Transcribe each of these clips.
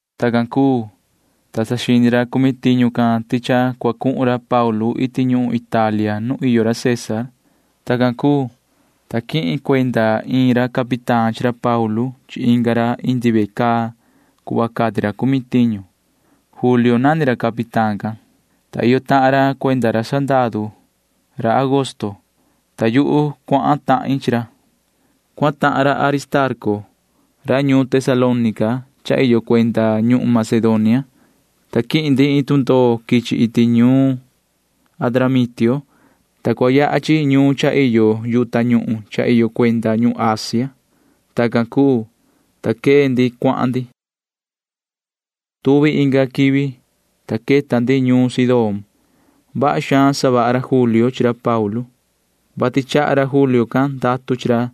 Tacan cuu, ta saxini ra cumi tiñu can ti cha cua cuhun ra Paulu iti ñuhun Italia nu iyo ra César. Tacan cuu, ta quihin cuenda iin ra capitán chi ra Paulu chi inga ra indi ve caa cuhva cati ra cumi tiñu. Julio nani ra capitán can, ta iyo tahan ra cuenda ra sandaru ra Augusto, [ta yuhu cuahan tahin chi ra]. Cuahan tahan ra Aristarco ra ñuun Tesalónica cha iyo cuenda ñuhun Macedonia, ta quihin ndi iin tundoo quichi iti ñuun Adramitio, ta cua yaha chi ñuun cha iyo yu tañuhun cha iyo cuenda ñuhun Asia. Tacan cuu, ta quee ndi cuahan ndi. Tuvi inga quivi, ta queta ndi ñuun Sidón. Vaha xaan savaha ra Julio chi ra Paulu, vati chaha ra Julio can ndatu chi ra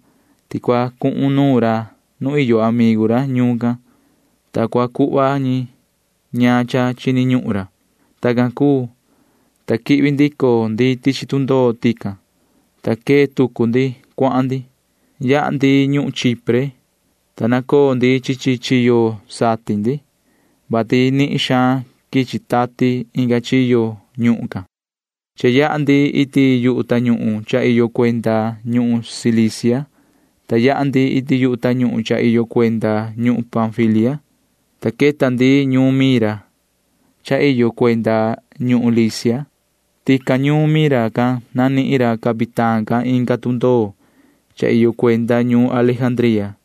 ti cua cuhun nuun ra nu iyo amigu ra ñuun can, ta cua cuhva ñi ñaan cha chini ñuhun ra. Tacan cuu, ta quihvi ndico ndi tichi tundoo tican, ta quee tucu ndi cuahan ndi. Yaha ndi ñuhun Chipre, ta nacoo ndi chi chi chiyo satin ndi, vati nihin xaan quichi tati inga chiyo ñuhun can. Cha yaha ndi iti yu tañuhun cha iyo cuenda ñuhun Cilicia, ta yaha ndi iti yu tañuhun cha iyo cuenda ñuhun Panfilia, ta queta ndi ñuun Mira cha iyo cuenda ñuhun Licia. Tican ñuun Mira can nanihin ra capitán can inga tundoo cha iyo cuenda ñuun Alejandría,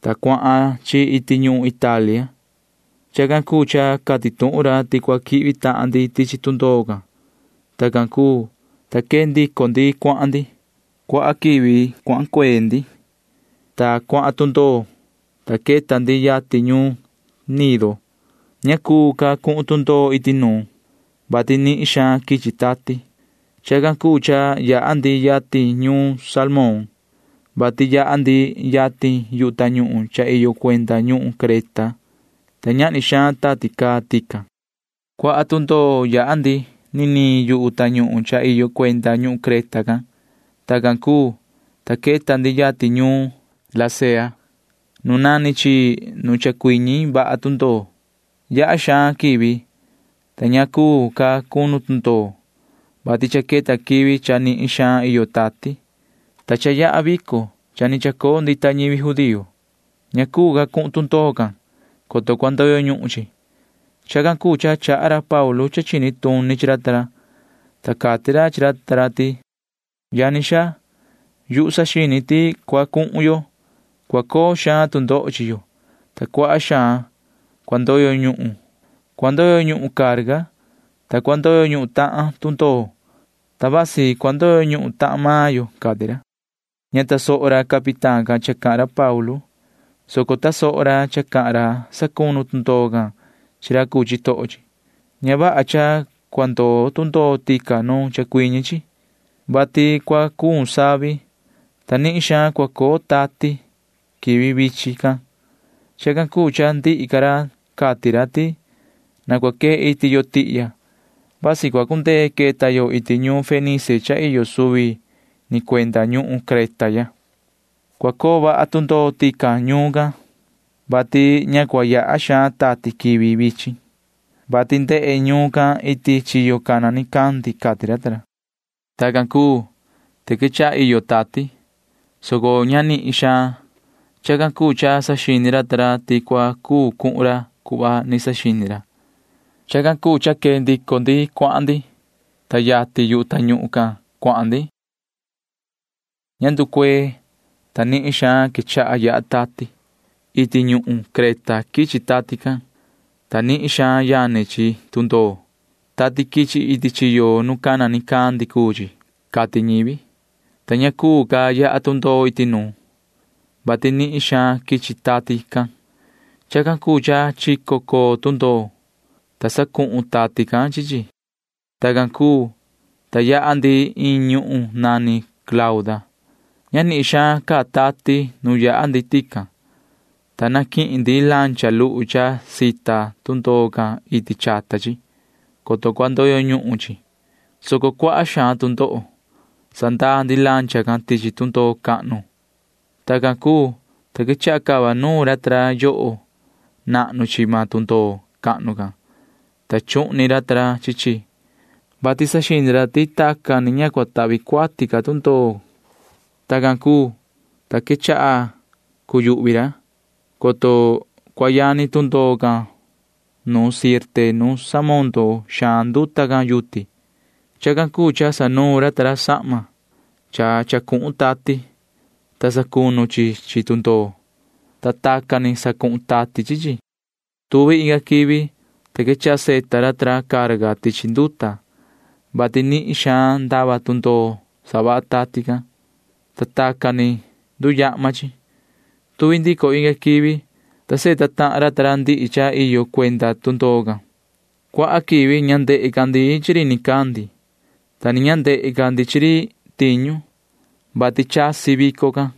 ta cuahan chi iti ñuhun Italia. Chacan cuu cha cati tuhun ra ti cua quihvi tahan ndi tichi tundoo can. Tacan cuu, ta quee ndico ndi cuahan ndi. Cuaha quivi cuahan cuee ndi, ta cuaha tu ndoho, ta queta ndi yatin ñuun Gnido. Ña cuu ca cuhun tundoo iti nuun, vati nihin xaan quichi tati. Chacan cuu cha yaha ndi yatin ñuun Salmón, vati yaha ndi yatin yu tañuhun cha iyo cuenda ñuhun Creta, ta ñahni xaan tati caa tican. Cuaha tu ndoho yaha ndi niniin yu tañuhun cha iyo cuenda ñuhun Creta can. Tacan cuu, ta queta ndi yatin ñuun Lasea nu nani chi nu chacuiñi vaha tundoo. Yaha xaan quivi, ta ña cuu ca cunu tundoo, vati cha queta quivi cha nihin xaan iyo tati, ta cha yaha vico cha ni chacoo ndita ñivi judío. Ña cuu ca cuhun tundoo can, coto cua ndoyo ñuhun chi. Chacan cuu cha chaha ra Paulu cha chini tuni chi ra ta ra, ta cati ra chi ra ti: ―Yani xaa, yuhu saxini ti tu cua cuhun yo, cua coo xaan tu ndoho chi yo, ta cuaha xaan cua ndoyo ñuhun. Cua ndoyo ñuhun carga, ta cua ndoyo ñuhun tahan tundoo, ta vasi cua ndoyo ñuhun tahan maan yo ―cati ra. Ña tasoho ra capitán cha cahan ra Paulu, soco tasoho ra cha cahan ra sacunu tundoo can chi ra cuu chitoho chi. Ña vaha cha cua ndoo tundoo tican nu chacuiñi chi, vati cua cuun xaan savi, ta nihin xaan cua coo tati quivi vichin can. Chacan cuu cha ndihi ca ra cati ra ti: ―Na cua quee iti yo tihya, vati vasi cua cundee queta yo iti ñuun Fenice cha iyo suvi ni cuenda ñuhun Creta ya. Cua coo vaha tundoo tican ñuun can, vati ña cua yaha xaan tati quivi vichin, vati ndehe ñuun can iti chiyo cana nicandi ―cati ra ta ra. Tacan cuu, ta quechaha iyo tati, soco ña nihin xaan. Chacan cuu cha saxini ra ta ra ti cua cuu cuhun ra cuhva ni saxini ra. Chacan cuu cha quee ndico ndi cuahan ndi, ta yatin yu tañuhun can cuahan ndi. Ña nducuee, ta nihin xaan quechaha yaha tati. Iti ñuhun Creta quichi tati can, ta nihin xaan yani chi tundoo. Tati quichi iti chiyo nu cana nicandi cuu chi, cati ñivi, ta ña cuu ca yaha tundoo iti nuun, vati nihin xaan quichi tati can. Chacan cuu cha chico coo tundoo, ta sacuhun tati can chi chi. Tacan cuu, ta yaha ndi iin ñuhun nani Clauda. Ña nihin xaan caa tati nu yaha ndi tican, ta naquihin ndi lancha luhu cha xita tundoo can iti chata chi, [coto cua ndoyo ñuhun chi,] soco cuaha xaan tu ndoho. Sandaa ndi lancha can tichi tundoo cahnu. Tacan cuu, ta quechaha cava nuun ra ta ra yoho nahnu chi maan tundoo cahnu can, ta chuhni ra ta ra chi chi, vati saxini ra ti tacan ni ña cua tahvi cuati tundoo. Tacan cuu, ta quechaha cuyuhvi ra, coto cua yani tundoo can nu Sirte nu samondo xaan nduta can yuti. Chacan cuu cha sanuun ra sahma cha cuhun tati, ta sacunu chi chi tundoo, ta tacan ni sacuhun tati chi chi. Tuvi inga quivi, ta quechaha savita ra ta ra carga tichi nduta, vati nihin xaan ndava tundoo savaha tati can, [ta tacan ni nduyahma chi]. Tuvi ndico inga quivi, ta savita tahan ra ndihi cha iyo cuenda tundoo can. Cuaha quivi ña ndehe ca ndi chi ri nicandi, ta ni ña ndehe ca ndi chi ri tiñu, [vati chasi vico can].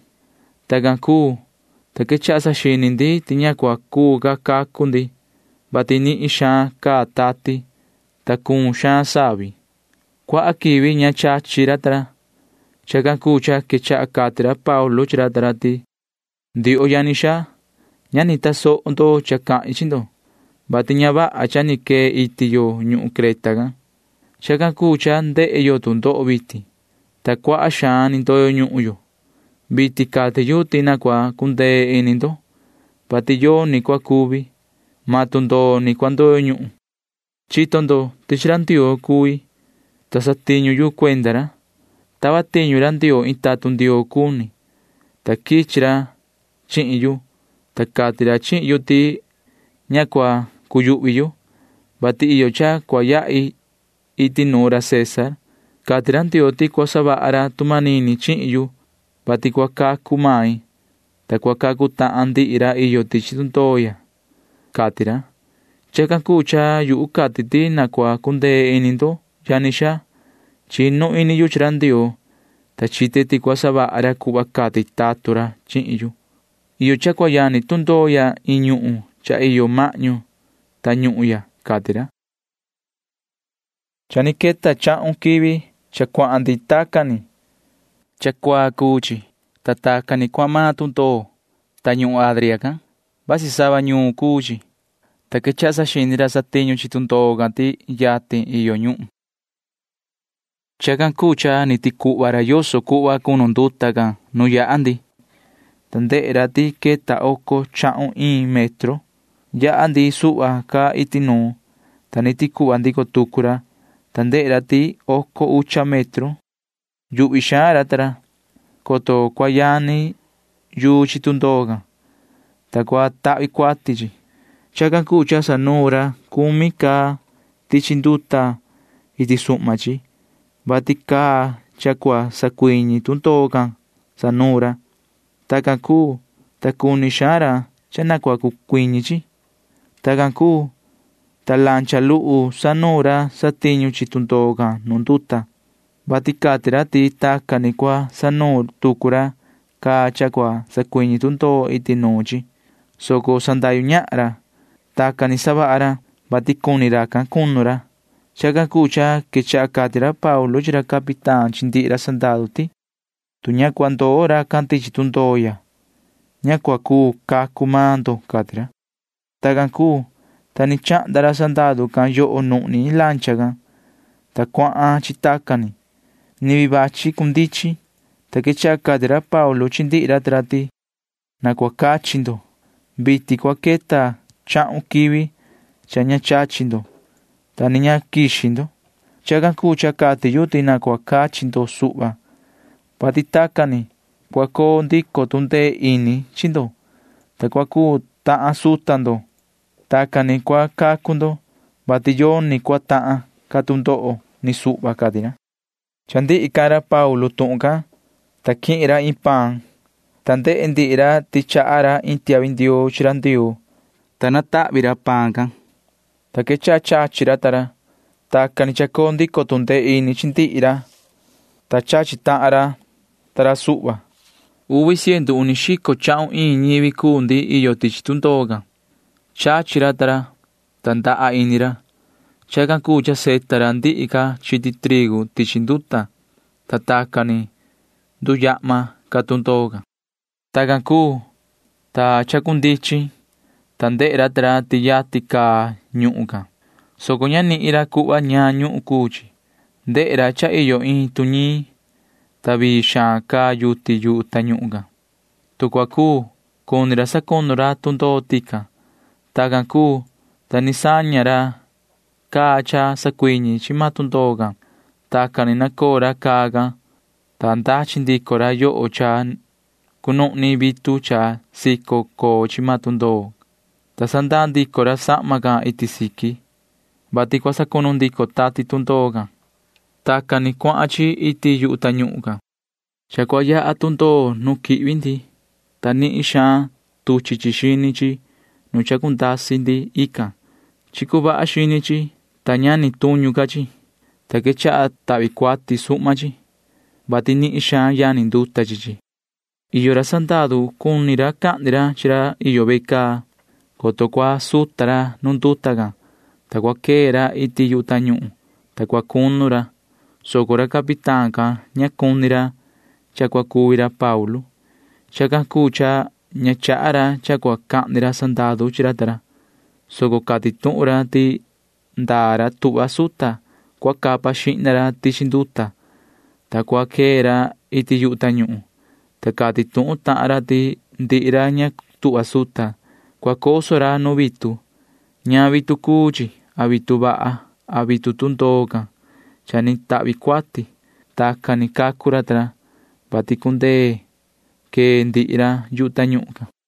Tacan cuu, ta quechaha saxini ndi ti ña cua cuu ca cacu ndi, vati nihin xaan caa tati, ta cuun xaan savi. Cuaha quivi ña chachi ra ta ra. Chacan cuu cha quechaha cati ra Paulu chi ra ta ra ti: ―Ndioho yani xaa, ña ni tasoho ndo cha cahin chi ndo, vati ña vaha cha ni quee iti yo ñuhun Creta can. Chacan cuu cha ndehe yo tu ndoho vitin, ta cuaha xaan ni ndoyo ñuhun yo. Vitin cati yu ti na cua cundee ini ndo, vati yoni cua cuvi. Maan tundoo ni cua ndoyo ñuhun. Chito ndo ti chi ra Ndioo cui, ta satiñu yu cuenda ra. Tava tiñu ra Ndioo iin tatun Ndioo cuni, ta quichi ra chihin yu, ta cati ra chihin yu ti ña cua cuyuhvi yu, vati iyo cha cua yahi iti nuun ra César. Cati ra Ndioo ti cua savaha ra tu manini chihin yu, vati cua cacu main, ta cua cacu tahan ndihi ra iyo tichi tundoo ya, cati ra. Chacan cuu cha yu cati ti na cua cundee ini ndo, yani xaa. Chinu ini yu chi ra Ndioo, ta chite ti cua savaha ra cuhva cati tatun ra chihin yu. Iyo cha cua yani tundoo ya iin ñuhun cha iyo mahñu tañuhun ya ―cati ra. Cha ni queta chahun quivi cha cuahan ndi tacan ni. Cha cuaa cuu chi, ta tacan ni cuahan maan tundoo tañuhun Adria can. Vasi sava ñuun cuu chi, ta quechaha saxini ra satiñu chi tundoo can ti yatin iyo ñuhun. Chacan cuu cha ni ticuhva ra yoso cuhva cunu nduta can nu yaha ndi, ta ndehe ra ti queta oco chahun iin metro. Yaha ndi suhva ca iti nuun, ta ni ticuhva ndico tucu ra, ta ndehe ra ti queta oco ucha metro. Yuhvi xaan ra ta ra, coto cua yani yuu chi tundoo can, ta cua tahvi cuati chi. Chacan cuu cha sanuun ra cumi caa tichi nduta iti suhma chi, vati caa cha cua sacuiñi tundoo can sanuun ra. Tacan cuu, ta cuni xaan ra cha na cua cundichin. Tacan cuu, ta lancha luhu sanuun ra satiñu chi tundoo can nu nduta, vati cati ra ti tacan ni cua sanuun tucu ra caa cha cua sacuiñi tundoo iti nuun chi, soco sandahyu ñahan ra. Tacan ni savaha ra, vati cuni ra cunu ra. Chacan cuu cha quechaha cati ra Paulu chi ra capitán chi ndihi ra sandaru ti: ―Tu ña cua ndoo racan tichi tundoo ya, ña cua cuu cacu maan ndo ―cati ra. Tacan cuu, ta ni chahnda ra sandaru can yoho nuhni lancha can, ta cuahan chi tacan ni. Ni vii vachi cundichin, ta quechaha cati ra Paulu chi ndihi ra ta ra ti: ―Na cua cachi ndo. Vitin cua queta chahun quivi cha ña chachi ndo, ta ni ña quixi ndo. Chacan cuu cha cati yu ti na cua cachi ndo suhva, vati tacan ni cua coo ndico tu ndee ini chi ndo, ta cua cuu tahan suta ndo. Tacan ni cua cacu ndo, vati yoni cua tahan ca tu ndoho ni suhva ―cati ra. Cha ndihi cahan ra Paulu tuhun can, ta quihin ra iin paan, ta ndehe ndihi ra ti chaha ra iin tiahvi ndioo chi ra Ndioo, ta tahvi ra paan can, ta quechaha chachi ra. Tacan ni chacoo ndico tu ndee ini chi ndihi ra, ta chachi tahan ra ta ra suhva. Uvi ciendu uni xico chahun iin ñivi cuu ndi iyo tichi tundoo can. Chachi ra ta ra, ta ndaha ini ra. Chacan cuu cha savita ra ndihi ca chiti trigu tichi nduta, ta tacan ni nduyahma ca tundoo can. Tacan cuu, ta chacundichin, ta ndehe ra ta ra ti yatin caa ñuhun can, soco ña nihin ra cuhva ñaan ñuhun cuu chi. Ndehe ra cha iyo iin tuñiin, ta vii xaan caa yuti yu tañuhun can. Tu cua cuu, cuni ra sacunu ra tundoo tican. Tacan cuu, ta ni saña ra caa cha sacuiñi chi maan tundoo can. Tacan ni nacoo ra caa can, ta ndachi ndico ra yoho cha cunuhni vitu cha sico coo chi maan tundoo, ta sandaa ndico ra sahma can iti siqui, vati cua sacunu ndico tati can tundoo. Tacan ni cuahan chi iti yu tañuhun can. Cha cua yaha tundoo nu quihvi ndii, ta nihin xaan tuchi chi xini chi nu chacundasi ndii can. Chicu vaha xini chi, ta ña ni tuñu ca chi, ta quechaha tahvi cuati suhma chi, vati nihin xaan yani nduta chi chi. Iyo ra sandaru cuni cahni ra chi ra iyo ve caa, coto cua suta ra nu nduta can, ta cua quee ra iti yu tañuhun, ta cua cunu ra, soco ra capitán can ña cuni ra cha cua cuvi ra Paulu. Chacan cuu cha ña chaha ra cha cua cahni ra sandaru chi ra ta ra, soco cati tuhun ra ti ndaa ra tuhva suta cua capa xihna ra tichi nduta, ta cua quee ra iti yu tañuhun, ta cati tuhun tahan ra ti ndihi ra ña tuhva suta―cua coso ra nu vitu―ñaan vitu cuu chi a vitu vaha a vitu tundoo can cha ni tahvi cuati. Tacan ni cacu ra ta ra, vati cundee quee ndihi ra yu tañuhun can.